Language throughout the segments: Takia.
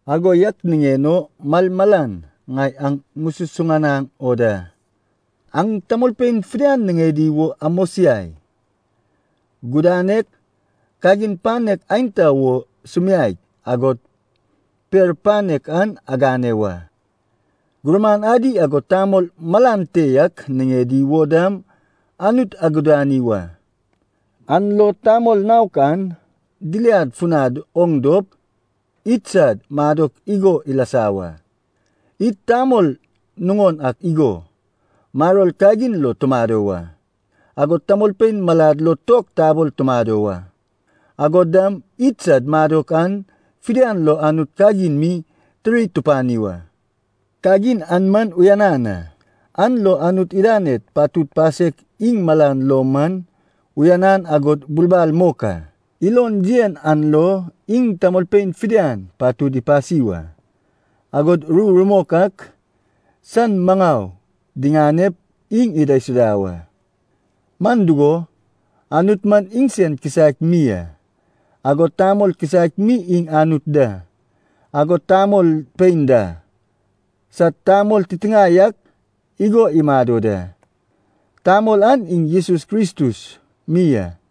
Ago yak niŋen o malmalan ŋai aŋ ŋususuŋanaŋ o da, aŋ tamolpein fidian niŋedi wo amosiai, gudanek, kagin panek aenta wo sumiaek, agod per panek an agane wa. Gurman adi agod tamol malan te yak niŋedi wo dam Anut agudani wa. An lo tamol naok an diliad funad oŋ dop, idsad madok igo ilasa wa. Id tamol nuŋon ak igo, maror kagin lo tumado wa. Agod tamolpein malad lo tok tabol tumado wa. Agod dam idsad madok an fidian lo Anut kagin mi tiri tupani wa. Kagin an man uyanan a, an lo Anut idaned patud pasek iŋ malan lo man uyanan agod bulbal mok a. Ilon yen an lo iŋ tamolpein fidian patud ipasi wa, agod ru rumok ak san maŋau diŋanep iŋ idaisuda wa. Man dugo, Anut man iŋsen kisaek mi a, agod tamol kisaek mi iŋ Anut da, agod tamolpein da, sad tamol titiŋae yak igo imado da. Tamol an iŋ Jesus Kristus mi a.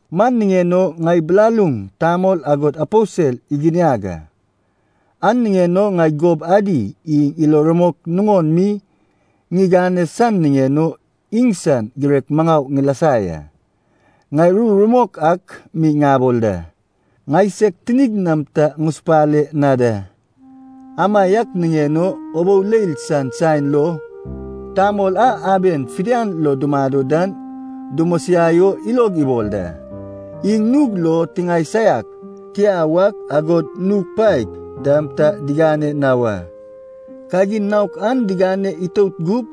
Man niŋen o ŋai bilaluŋ tamol agod aposel iginiag a. An niŋen o ŋai gob adi iŋ ilo rumok nuŋon mi diŋane san niŋen o iŋsad girek maŋau ŋilasa ya. Ŋai ru rumok ak mi ŋabol da, ŋai seg tinig nam ta ŋusupale na da. Amaiak niŋen o ubou leil san saen lo tamol a aben fidian lo dumado dan dumosiai o ilog ibol da. Iŋ nug lo tiŋae saiak tia wak, agod nug paek dam ta digane na wa. Kagin naok an digane itout gup,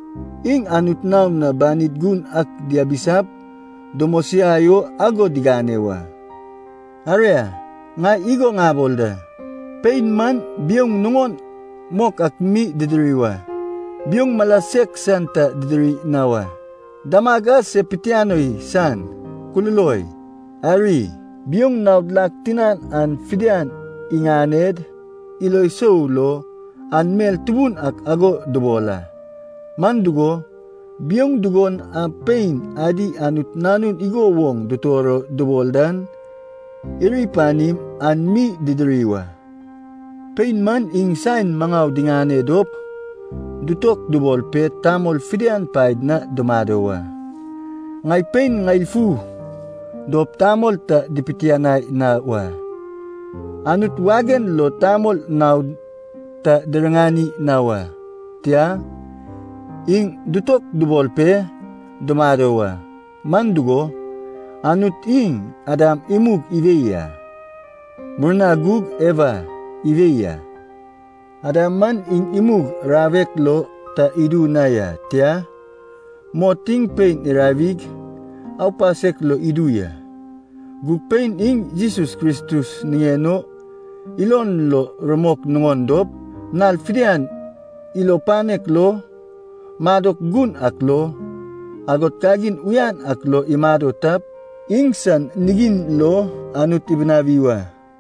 iŋ Anut naon na banid gun ak diabisap dumosiai o ago digane wa. Aria, ŋai igo ŋabol da, pein man biouŋ nuŋon mok ak mi didiri wa. Biouŋ mala sek san ta didiri na wa. Damag a se pitianoi san, kululoi, ariy, biouŋ naod lak tinan an fidian iŋaned ilo sou lo an mel tubun ak ago dubol a. Man dugo, biouŋ dugon a pein adi Anut nanun igo woŋ dutor o dubol dan iri panim, an mi didiri wa. Pein man iŋ saen maŋau diŋane dop dutokubol pe tamol fidian paed na dumado wa. Ŋai pein ŋeil fu dop tamol ta dipiteŋanai na wa. Anut wagen lo tamol naod ta diriŋani na wa, tia, iŋ dutokubol pe dumado wa. Man dugo, Anut iŋ Adam imug iwei a. Murna gug Ewa iwei a. Adam man iŋ imug rawek lo ta idu na ya. Tia, mot iŋ pein irawig aupasek lo idu ya. Gug pein iŋ Jesus Kristus niŋen o ilon lo rumok nuŋon dop, nal fidian ilo panek lo, madok gun ak lo, agod kagin uyan ak lo imado tap, iŋsan nigiŋ lo Anut ibinawi wa.